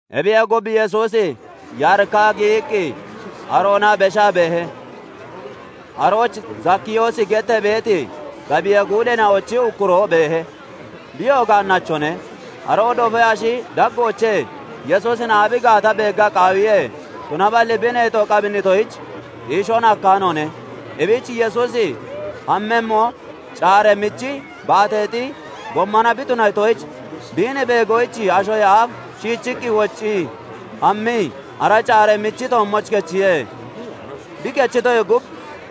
Ebiyee gub, Yesuusi Yaarika giyiqqi aroona beshaa beehe. Arooch Zakiyoos gettee beeti gabiyee guudeena'ochi ukkuroo beehe; biyoo gaannachone. Aroo dofee ashi daggoochee Yesuusin aabi gaata beegga qaawiye; tunaballi bi neexo qabinnitoyich, xiishoon hakkaanoone. Ebich Yesuusi hammemmo caaree (canee) michi baateexi gommona bi tunatoyich, biin beegoyich ashoyee aaf shiichiqqi woccii hammii ara caaree michi toommooch kechiye. Bi kechitoyee gub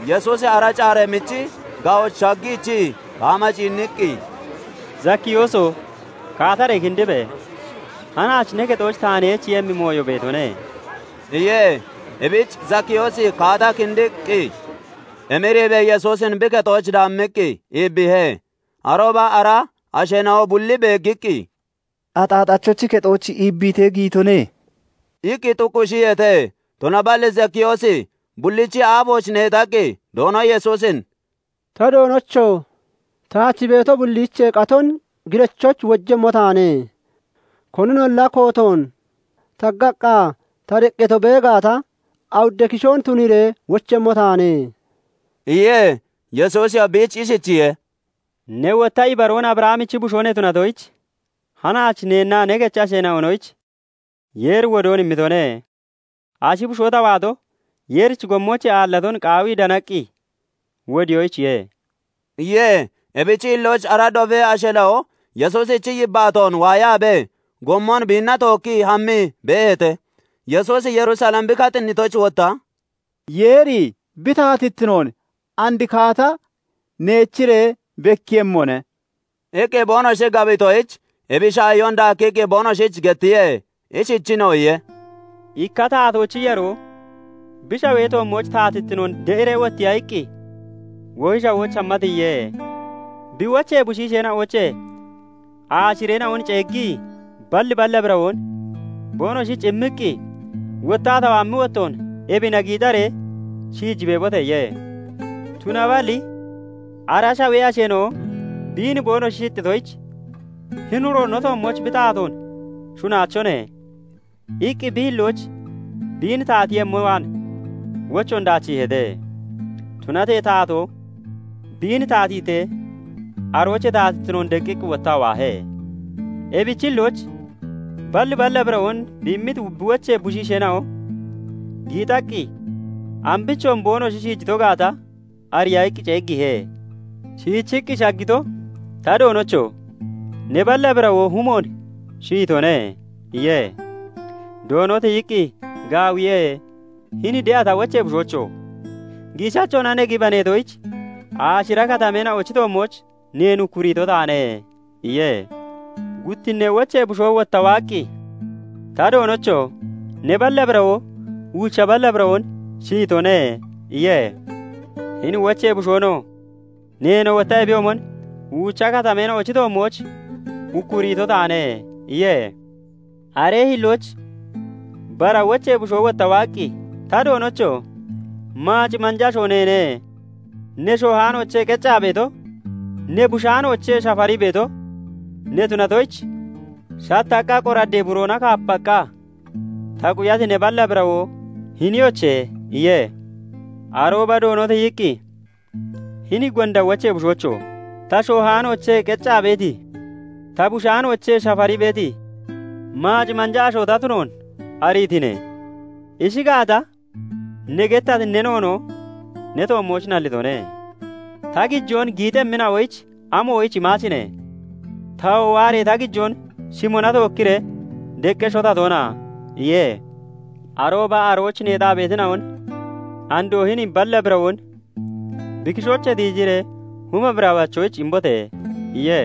Yesuusi ara caaree michi ga'ooch shaggiichii kaama ciinniqqi, "Zakkiyooso! Kaataree kindibe! Hanaach ne kexooch taan heechiiyemmi mooyo beetone" iye. Ebich Zakiyoos kaataa kindiqqi emiriibee Yesuusin bi kexooch daammiqqi iibbiihe. Arooba ara asheena'o bulli beeggiqqi, "Axaaxachochi kexooch iibbiitee giyitone" iqqi xuuqqishiyeete. Tunaballi Zakiyoosi bullichi aafooch neexaqqi Doono Yesuusin "Ta Doonocho! Taach beeto bulliichee qaton girachoyich wojemmo taane; koninolla kootoon taggaqqa ta deqqato bee gaata, awudda kishoon tuniiree wochemmo taane" iye. Yesuusiyoo biich ishichiye:- "Ne wotta ibaroon Abrahamichi bushoo ne tunatoyich, hanaach neennaa ne kechi ashoonoyich Yeeri wodoon immitone. Ashi bushoo ta waato, Yeerichi gommoochee aallaton qaawii danaqqi wodiyoyichiye" iye. Ebichi hillooch ara dofee asheena'o Yesuusichi yibbaatoon waayaabee, gommon biinna tookkii hammii beeheete; Yesuusi Yerusalem bi katinnitoyich, wotta "Yeeri bi taatittinoon and kaata neechiree bekkiiyemmone" iqqi boonoshi gabitoyich, ebi shaahiyoon daakkiqqi boonoshich gettiye. Ishichiinoo iye:- "Ikka taatoochi yaroo bi shawee toommooch taatittinoon de'iree wottiya iqqi wohi shawooch hamma tiyiye. Bi wochee bushiisheena'oochee aashireena'on ceeggii balli balla birawoon boonoshich immiqqi, 'Wottaa ta waammi wottoon ebina giixaree shiiji beebote!' iye. "Tunaballi ara shawee asheena'o biin boonoshi shixxitoyich, 'Hini uro no toommooch bi taatoon shunnaachone' iqqi bi hillooch biin taatiiyemmo waan wochoon daachiiheete. "Tunatee taatoo biin taatiitee, aroochee taatittinoon deqqiqqi wottaa waahe. Ebichi hillooch balli balla birawoon bi immiti bi wochee bushiisheena'o giixaqqi ambichoon boonoshi shiijito gaata ariya iqqi ceeggiihe. "Shichiqqi shaggito 'Ta doonocho! Ne balla birawoo humoon shiyitone' iye. "Doono tiyiqqi, 'Gaawiye; hini de'a ta wochee bushoocho! Giishachoona ne gibaneetoyich, aashira katameena'ochi toommooch neen ukkuriito taane' iye. "Guttinnee wochee bushoo wotta waaqqi, 'Ta doonocho! Ne balla birawoo uucha balla birawoon shiyitone' iye. "Hini wochee bushoonoo 'Neenoo wotta ebiyoomon uucha katameena'ochi toommooch ukkuriito taane' iye. "Aree hillooch bara wochee bushoo wotta waaqqi, 'Ta doonocho! Maac manja asho neene; ne shoohaanoochee qeccaa beeto, ne bushaanoochee shafarii beeto ne tunatoyich, shattaqqa qoraddee buroona kaapaqqa ta quyati ne balla birawoo hiniyoche!' iye. "Arooba doono tiyiqqi, 'Hini gonda wochee bushoocho! Ta shoohaanoochee qeccaa beeti, ta bushaanoochee shafarii beeti, maac manja asho ta tunoon ariitine? Ishi gaata, ne gettati ne noonoo ne toommooch nallitone. Ta gijoon giixemmina'oyich amoyich imaachine? Tawoo waaree ta gijoon shimona tookkiree deqqesho ta toona?' iye. "Arooba arooch neexaa beetina'on 'Andoo hini balla birawoon bi kishoochee tiijiree huma birawachoyich imbote!' iye.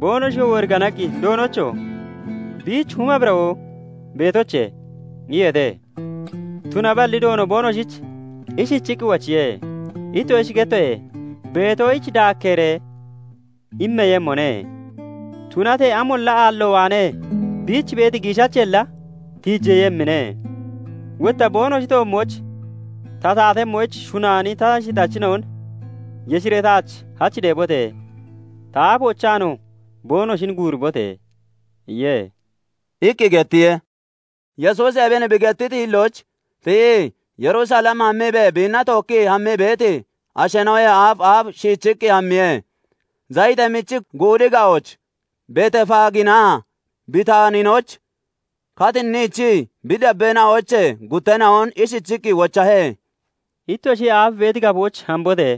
"Boonoshiyoo woriganaqqi, 'doonocho! Biich huma birawoo beetoche!' iyeete. "Tunaballi doono boonoshich ishichiqqi wochiye; 'Ittoshich gettoye; beetoyich daakkeeree immeeyemmone; tunatee amolla aallo waanee biich beeti giishacheella tiijeeyemmine. Wotta boonoshi toommooch ta taatemmoyich shunaani ta shixachina'on yeshiree taach hach deebote! Ta aafoochaanoo boonoshin guuribote!' iye" iqqi gettiye. Yesuusi ebin bi gettiti hillooch tiyii, Yerusalem hammiibee biinna tookkii hammii beeti asheena'oyee aaf aaf shiichiqqi hammiye. Zayitee michi Guudi ga'ooch beeti Beetefaaginaa Bitaaninooch katinniichii, bi dabbeena'oochee gutteena'on ishichiqqi wochahe; "Ittoshiyee aaf beeti gafooch hambote!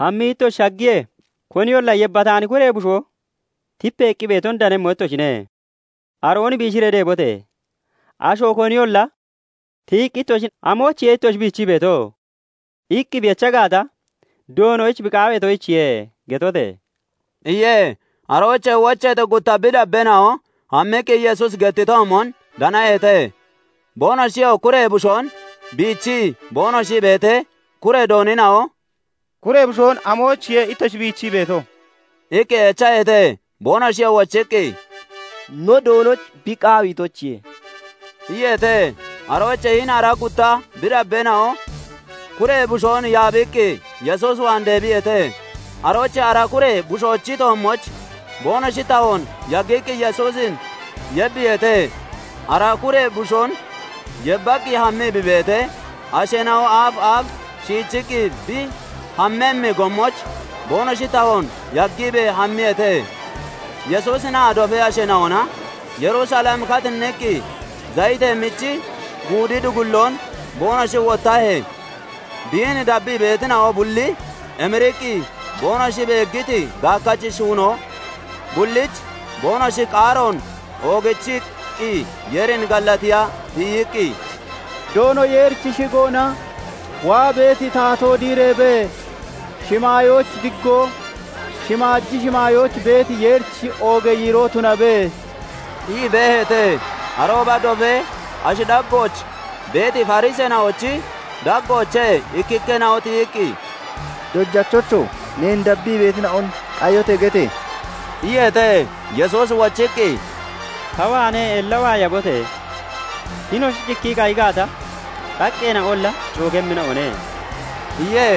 Hammii ittoshi shaggiyee, koniyolla yebbataani kuree bushoo tipeeqqi beeton danemmo ittoshine; aroon biishiree deebote! Asho koniyolla tiyiqqi ittoshin 'Amoyichiye ittoshi biichii beeto?' iqqi bi echa gaata, 'Doonoyich bi qaaweetoyichiye' getote!" iye. Aroochee wocheeti gutta bi dabbeena'o hammiqqi Yesuusi gettitoomon danaheete. Boonoshiyoo kuree bushoon biichii boonoshi beetee, kuree doonina'o "Kuree bushoon amoyichiye ittoshi biichii beeto?" iqqi echaheete. Boonoshiyoo wochiqqi, "No Doonoyich bi qaaweetoyichiye" iyeete. Aroochee hini ara gutta bi dabbeena'o kuree bushoon yaabiqqi Yesuus waan deebiyeete. Aroochee ara kuree bushoochi toommooch boonoshi tahoon yaggiqqi Yesuusin yebiiheete. Ara kuree bushoon yebbaqqi hammii bi beetee, asheena'o aaf aaf shiichiqqi bi hammemmi gommooch boonoshi tahoon yaggiibee hammiyeete. Yesuusinaa dofee asheena'ona Yerusalem katinniqqi Zayitee Michi Guudi dugulloon boonoshi wottahee, biin dabbii beetina'o bulli emiriqqi boonoshi beeggiti gaakkachi shuunoo bullich boonoshi qaaroon oogichiqqi Yeerin gallatiya tiyiqqi, "Doono Yeerichi shigoona waa beeti taatoo diireebe! Shimaayooch diggoo, shimaaji shimaayooch beeti Yeerich oogee yiiroo tunabe!" ii beeheete. Arooba dofee ashi daggooch beeti Fariseena'ochi daggoochee ikkikkeena'o tiyiqqi, "Dojachocho! Neen dabbii beetina'on 'Qayote!' gete!" iyeete. Yesuusi wochiqqi "Ta waanee ella waayabote! Hinoshi cikkii qayi gaata, xaqqeena'olla cookemmina'one" iye.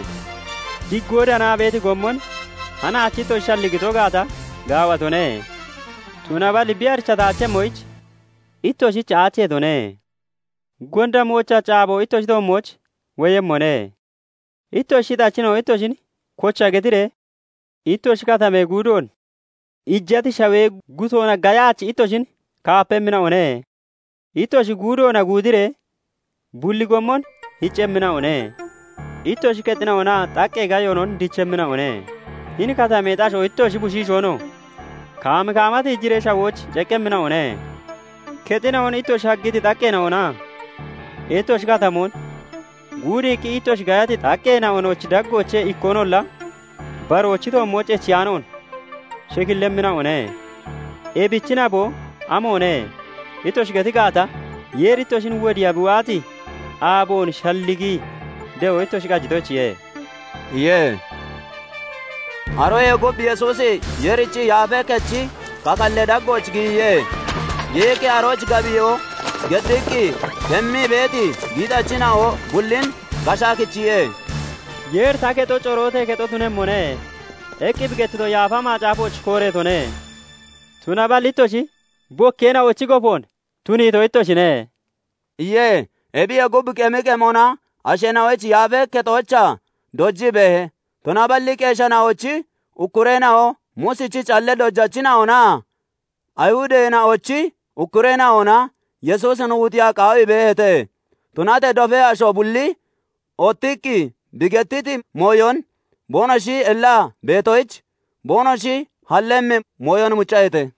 "aaboon diggoo danaa beeti gommon hanaachi ittoshi shalligito gaata, gaawatone; tunaballi bi arichataachemmoyich ittoshich aacheetone. Gonda moochachi aabo ittoshi toommooch woyemmone; ittoshi shixachina'o ittoshin kocha getiree ittoshi katamee guudoon iijati shawee guttoona gayaachi ittoshin kaapemmina'one; ittoshi guudoona guudiree bulli gommon hiccemmina'one. Ittoshi kexina'onaa xaqqee gayoonon dichemmina'one; hini katameexi asho ittoshinoo, ittoshi bushiishoonoo kaam kaama tiijiree shawooch ceqqemmina'one; kexina'on ittoshi haggiti xaqqeena'onaa ittoshi katamoon guudiiqqi ittoshi gayati xaqqeena'onochi daggoochee ikkoonolla baroochi toommooch echiyaanoon shekillemmina'one. 'Ebichi naboo amoone?' ittoshi geti gaata, Yeeri ittoshin wodiiya bi waati aaboon shalligii de'o ittoshi qajitoyichiye" iye. Aroyee gub Yesuusi Yeerichi Yaafee Kechi kakallee daggooch giyiye. Giyiqqi arooch gabiyoo geddiqqi kemmii beeti giixachina'o bullin gashaa kichiye. "Yeeri 'Ta kexo corootee kexo tunemmone' iqqi bi gettito Yaafa Macaafooch kooreetone; tunaballi ittoshi 'Bokkeena'ochi gofoon' tuniito ittoshine" iye. Ebiyee gub, qemi qemona asheena'oyich Yaafee Kexoochaa dojii beehe; tunaballi qeesheena'ochi ukkureena'o, Muusichi callee dojachina'onaa Ayihudeena'ochi ukkureena'ona Yesuusin wuxiya qaawii beeheete; Tunatee dofee asho bulli ottiqqi bi gettiti mooyon boonoshi ellaa beetoyich, boonoshi hallemmi mooyon muccaheete.